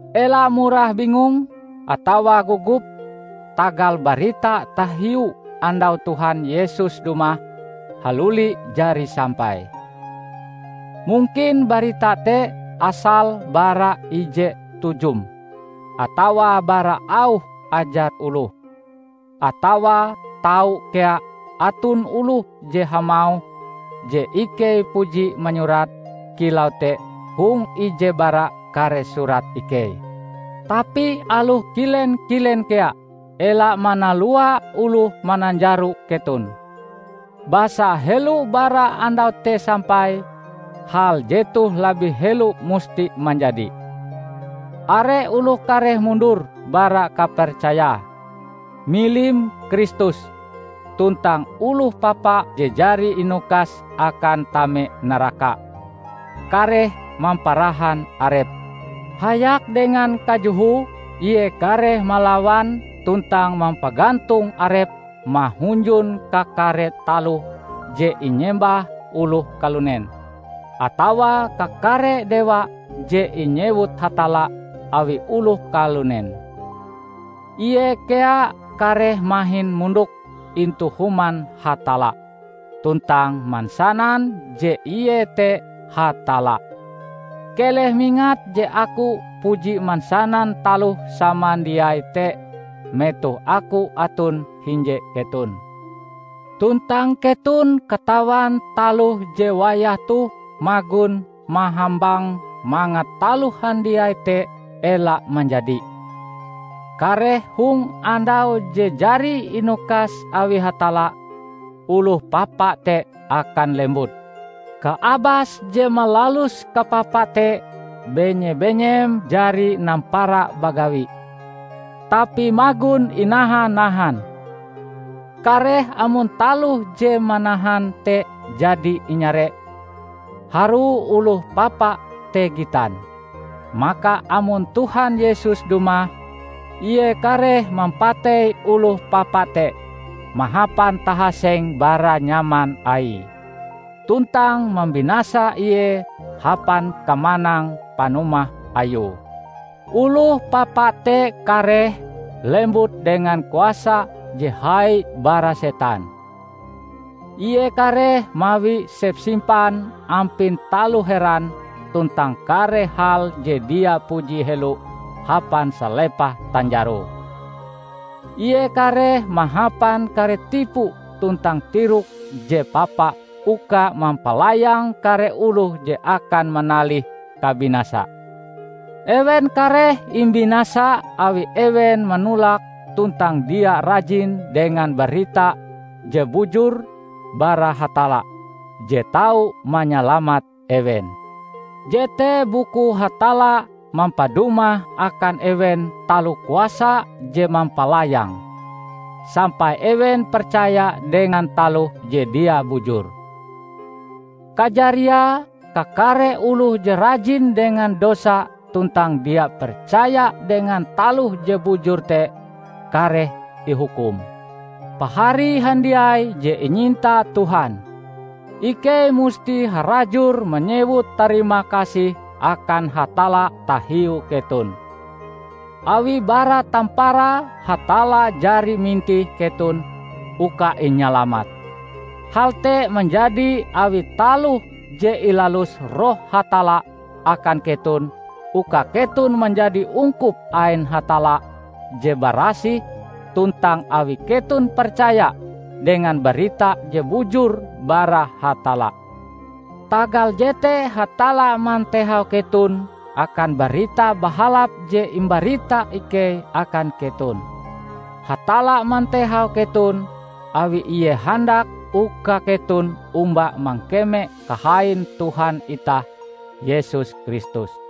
Ela murah bingung atawa gogop tagal barita tahiu andau Tuhan Yesus dumah haluli jari sampai. Mungkin barita te asale bara ije tujum, atawa bara auh ajar oloh; atawa tau kea aton oloh je hamauh je ikei puji manyurat kilau te hong ije bara kare surat ikei. Tapi aloh kilen-kilen kea, ela manalua oloh mananjaro keton. Basa helo bara andau te sampai, hal jetoh labih helo musti manjadi: Are oloh kareh mundur bara kapercayae, milim Kristus; tuntang oloh papa je jari inukas akan tame naraka, kareh mamparahan arepe. Hayak dengan kajohoe ie kareh malawan tuntang mampagantong arepe mahunjun kakare taloh je inyembah oloh kalunen, atawa kakare dewa je inyewut Hatalla awi oloh kalunen. Ie kea kareh mahin mondok intu Human Hatalla tuntang mansanan je ie te Hatalla. Keleh mingat je aku puji mansanan taloh samandiai te metoh aku aton hinje keton. Tuntang keton katawan taloh je wayah toh magon mahambang mangat taloh handiai te ela manjadi. Kareh hong andau je jari inukas awi Hatalla, Oloh Papa te akan lembut. Kaabas je malalus kapapa te benye-benyem jari nampara bagawi, tapi magon inaha-nahan. Kareh amon taloh je manahan te jadi inyare, harue Oloh Papa te gitan. Maka amon Tuhan Yesus dumah, Ie kareh mampatei Oloh Papa te mahapan tahaseng bara nyaman Aie, tuntang mambinasa ie hapan kamanang panumah Ayue. Oloh Papa te kareh lembut dengan kuasa je hai bara setan. Ie kareh mawi sepsimpan ampin taloh heran tuntang kare hal je dia puji helo hapan salepah tanjaroe. Ie kareh mahapan kare tipu tuntang tirok je papa uka mampalayang kare oloh je akan manalih kabinasa. Ewen kareh imbinasa awi ewen manolak tuntang dia rajin dengan barita je bujur bara Hatalla je tau manyalamat ewen. Jete bukue Hatalla mampadumah akan ewen taloh kuasa je mampalayang, sampai ewen percaya dengan taloh je dia bujur. Kajariae, kakare oloh je rajin dengan dosa tuntang dia percaya dengan taloh je bujur te, kareh ihukum. Pahari handiai je inyinta Tuhan! Ikei musti harajur manyewut tarimakasih akan Hatalla tahiu keton, awi bara tamparae Hatalla jari mintih keton uka inyalamat. Hal te manjadi awi taloh je ilalus Roh Hatalla akan keton uka keton manjadi ungkup ain Hatalla je barasih tuntang awi keton percaya dengan barita je bujur bara Hatalla. Tagal jete Hatalla mantehau keton akan Barita Bahalap je imbarita ikei akan keton. Hatalla mantehau keton, awi Ie handak uka keton omba mangkeme kahain Tuhan itah Yesus Kristus.